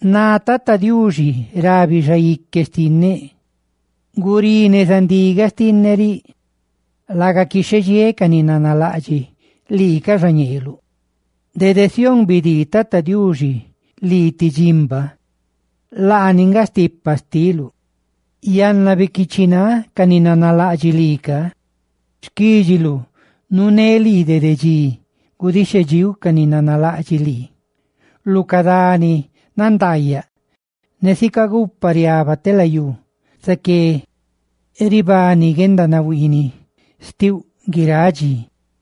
Ná Tata Diuxi rabi xaique xtinneꞌ: «Gurí neza ndigaꞌ xtinneꞌ riꞌ, laga quixhedxiéꞌ ca ni nanalaꞌdxiꞌ lii ca xañeeluꞌ.» Dede Sión bidii Tata Diuxi lii ti dximba, laani nga stipa xtiuꞌ. ¡Yanna, biquiichiꞌ náꞌ ca ni nanalaꞌdxiꞌ lii ca! Xquídxiluꞌ nuuné lii dede dxi gudixhedxíuꞌ ca ni nanalaꞌdxiꞌ lii. Lu ca dani nandaayaꞌ, ne sica gupa riaba telayú, zaqué ribani guendanahuiiniꞌ xtiuꞌ guiráꞌ dxi.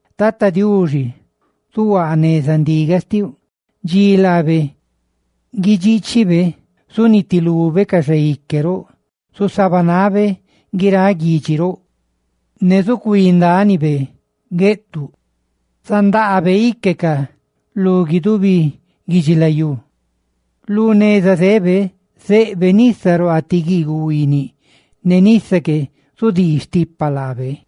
Tata Diuxi zuhuaa neza ndigaꞌ xtiuꞌ; dxi laabe guidxiichibe zunitilube ca xaique roꞌ; zusabanabe guiráꞌ guidxi roꞌ; ne zucuí ndánibe gueꞌtuꞌ; ¡zandaabe íquecaꞌ lu guidubi guidxilayú! Lu neza zebe zeꞌbe nisa ruaa ti guiiguꞌ huiiniꞌ, ne nisa que zudii stipa laabe.